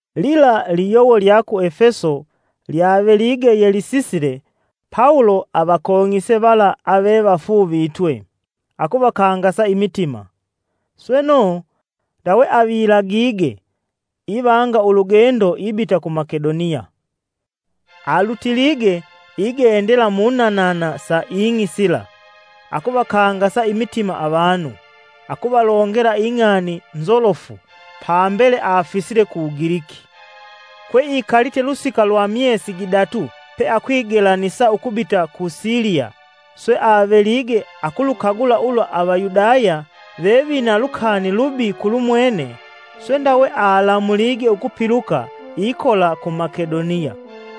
Lila liyowo lya ku Efeso lyavelige yelisisile Pawulo avakong'ise vala ave vafuuvitwe, akuvakangasa imitima. Sweno, ndawe avilagige, ivanga ulugendo ibita ku Makedoniya. Alutilige igendela munanana sa ing'i sila akuvakangasa imitima avanu akuvalongela ing'ani nzolofu pambele afisile ku Ugiliki kwe ikalite lusika lwa myesi gidatu pe akwigelanisa ukubita ku Siliya swe avelige akulukagula ulwa Avayudaya vevina lukani lubi kulumwene, swe ndawe alamulige ukupiluka ikola ku Makedoniya.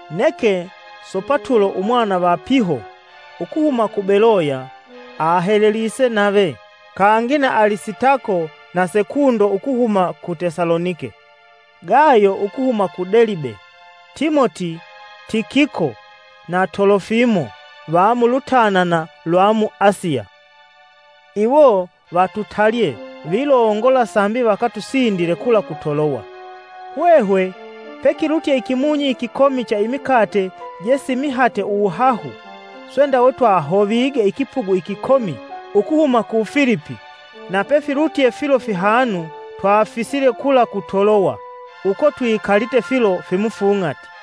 Neke Sopatulo umwana va Piho, ukuhuma ku Beloya, ahelelise nave, kangi na Alisitako na Sekundo ukuhuma ku Tesalonike, Gayo ukuhuma ku Delibe, Timoti, Tikiko na Tolofimo va mulutanana lwa mu Asiya. Iwo vatutalye vilongola sambi vakatusindile kula ku Toloya. Hwehwe, pekilutye ikimunyi ikikomi cha Imikate je simihate uwuhahu, swe ndawe twahovige ikipugu ikikomi ukuhuma ku Filipi na pefilutye filo fihanu twafisile kula ku Toloya. Uko twikalite filo fimufung'ati.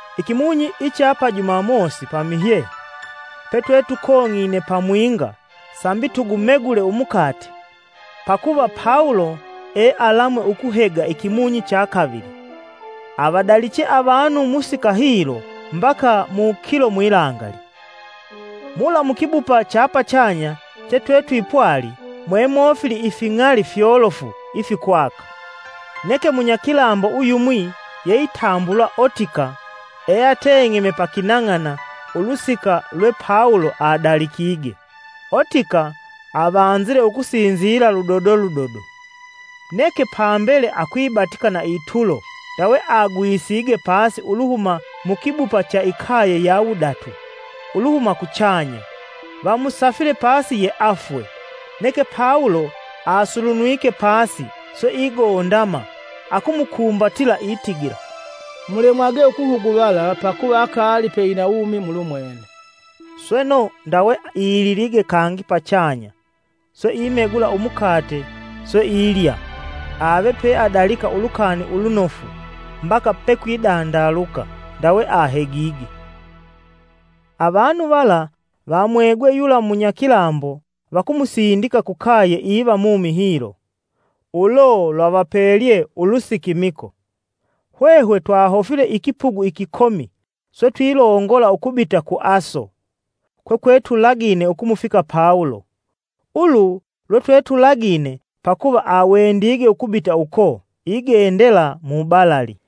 Ikimunyi icha pa Jumamosi pamihye petwetukong'ine pamwinga sambi tugumegule umukate, Pakuva Pawulo e alamwe ukuhega ikimunyi cha kavili, avadaliche avanu musika hilo mbaka mukilo mwilangali. Mula mukibupa cha pachanya, che twetwipwali, mwemofili ifing'ali fyolofu ifikwaka. Neke munyakilambo uyumwi yeitambulwa Otika eateng'eme pakinang'ana ulusika lwe Pawulo adalikige. Otika avanzile ukusinzila ludodo ludodo neke pambele akwibatika na itulo ndawe agwisige pasi uluhuma mukibupa cha ikaye ya wudatu uluhuma kuchanya. Vamusafile pasi yeafwe. Neke Pawulo asulunwike pasi, swe igondama, akumukumbatila itigila, “Mulemwage ukuhuguvala pakuva akaali pe ina uwumi mulumwene.” Sweno ndawe ililige kangi pachanya swe imegula umukate swe ilya. Ave peadalika Ulukani Ulunofu mbaka pekwidandaluka, ndawe ahegige. Avanu vala vamwegwe yula munyakilambo vakumusindika kukaye iva mumi hilo, ulo lwavapelye ulusikimiko. Hwehwe twahofile ikipugu ikikomi swe twilongola ukubita ku Aso kwetwetulagine ukumufika Pawulo. Ulu lwetwetulagine; pakuva awendige ukubita uko igendela mubalali.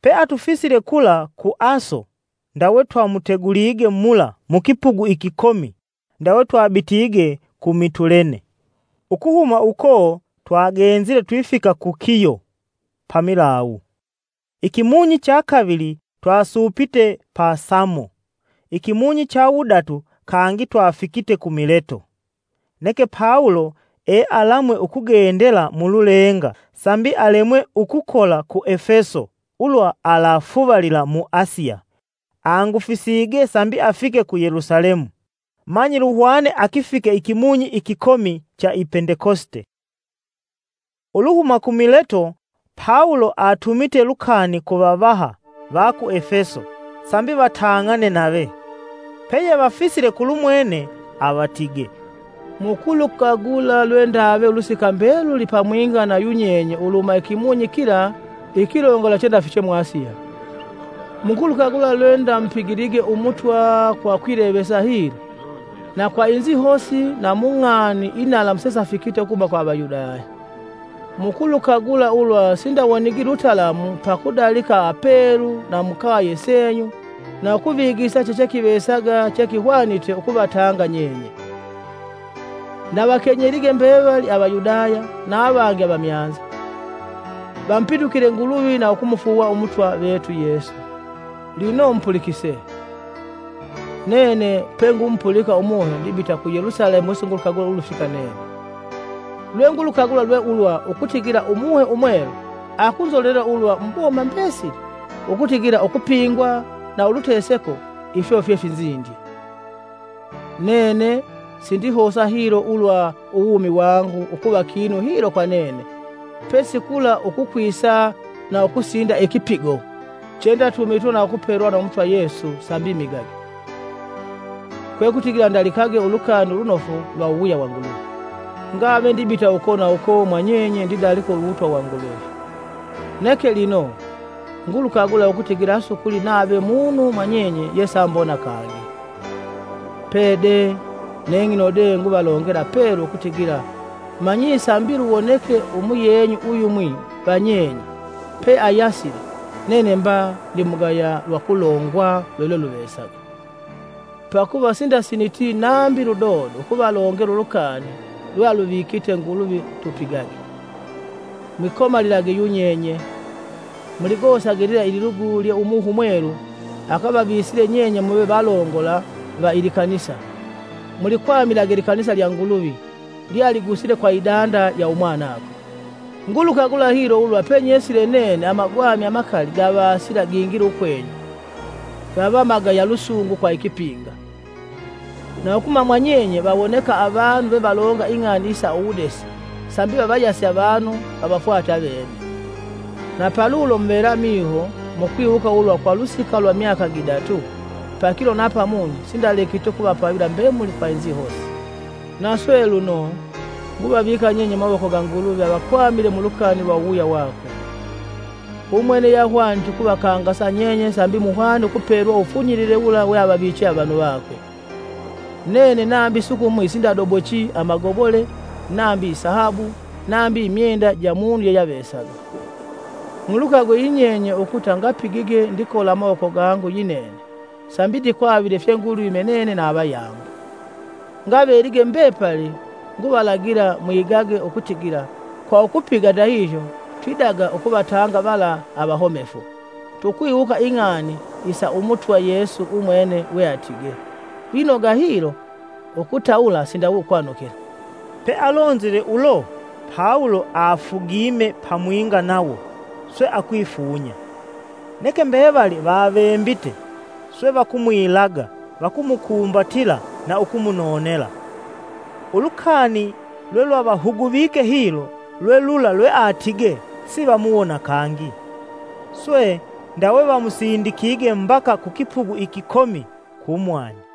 Pe, atufisile kula ku Aso, ndawe twamutegulige mula mukipugu ikikomi, ndawe twabitige ku Mitulene. Ukuhuma uko twagenzile twifika ku Kiyo pamilawu. Ikimunyi chakavili twasuupite pa Samo, ikimunyi cha wudatu kangi twafikite ku Mileto. Neke Pawulo ealamwe ukugendela mululenga sambi alemwe ukukola ku Efeso ulwa alafuvalila mu Asiya. Angufisige sambi afike ku Yelusalemu manyi luhwane akifike ikimunyi ikikomi cha i Pendekosite. Uluhuma ku Mileto Pawulo atumite lukani ku vavaha va ku Efeso sambi vatang'ane nave. Peyevafisile kulumwene avatige, “Mukulukagula lwendave ulusika mbeluli pamwinga na yunyenye uluhuma ikimunyi kila ikilongola chendafiche mu Asiya. Mukulukagula lwendamupigilige Umutwa kwa kwilevesa hilo, na kwa inzihosi na mung'ani inalamu sesafikite ukuhuma kwa Avayudaya. Mukulukagula ulwa sindawonigi lutalamu pakudalika apelu na mukaye senyu na ukuvigisa chechekivesaga chekihwanite ukuvatanga nyenye. Ndavakenyelige mbevali Avayudaya, na avangi avamyanza, vamupitukile Nguluvi na ukumufuuwa Umutwa vetu Yesu. Lino, mupulikise! Nene, Pengumupulika Umuhe, ndibita ku Yelusalemu wesingulukagula ulufika nene. Lwengulukagula lwe ulwa ukutigila Umuhe Umwelu akunzolelela ulwa muboma mbesili ukutigila ukupingwa na uluteseko ifyo fyefinzindye. Nene, sindihosa hilo ulwa uwumi wangu ukuva kinu hilo kwa nene pesi kula ukukwisa na ukusinda ikipigo chendatumitwe na ukupelwa na Umutwa Yesu sambi migage, kwekutigila ndalikage ulukani ulunofu lwa uwuwuya wa Nguluvi. “Ngave ndibita uko na uko mwanyenye ndidalika Uwutwa wa Nguluvi. Neke lino, ngulukagula ukutigila asukuli nave munu mwanyenye yesaambona kangi. Pede, neng'ino de nguvalongela pelu ukutigila manyi sambi luwoneke umuyenyu uyumwi va nyenye peayasile, nene mba ndimugaya lwakulongwa lwelweluvesaga. Pakuva sindasiniti nambi ludodo ukuvalongela ulukani lwealuvikite Nguluvi tupigage. Mwikomalilage yunyenye; muligosage lila lilugu lye Umuhe Umwelu akavavisile nyenye muve valongola va ilikanisa. Mulikwamilage likanisa lya Nguluvi lyealigusile kwa idanda ya Umwanakwe. Ngulukagula hilo ulwa penyesile nene amagwami amakali gavasila gingila ukwenyu, gava magaya lusungu kwa ikipinga. Na ukuhuma mwa nyenye vawoneka avanu vevalonga ing'ani isa uwudesi sambi vavayase avanu vavafwate avene. Na palulo muvela miho mukwiwuka ulwa kwa ulusika lwa myaka gidatu, pakilo na pamunyi sindalekiti ukuvapavila mbemuli kwa inzihosi. “Na swe lino, nguvavika nyenye mumawoko ga Nguluvi avakwamile mulukani lwa uwuwuya wakwe. Umwene yeahwanite ukuvakangasa nyenye sambi muhwane ukupelwa uwufunyilile wula weavaviche avanu vakwe. Nene nambi sukumwi sindabodochi amagobole, nambi isahabu, nambi imyenda ja munu yeyeavesaga. Mulukagwe yinyenye ukuta ngapigige ndikola amawoko gangu yinene sambi ndikwavile fyengulwime nene na avayangu. Ngavelige mbepali nguvalagila mwigage ukutigila kwa ukupiga ndahihyo twidaga ukuvatanga vala avahomefu, tukwiwuka ing'ani isa Umutwa Yesu umwene weatige: ‘Lwinoga hilo ukutawula sindawe ukwanukila.’” Pealonzile ulo, Pawulo afugime pamwinga nawo, swe akwifunya. Neke mbevali vavembite; swe vakumwilaga vakumukumbatila na ukumunonela. Ulukani lwelwavahuguvike hilo lwelula lweatige sivamuwona kangi. Swe, ndawe vamusindikige mbaka ku kipugu ikikomi kumwani.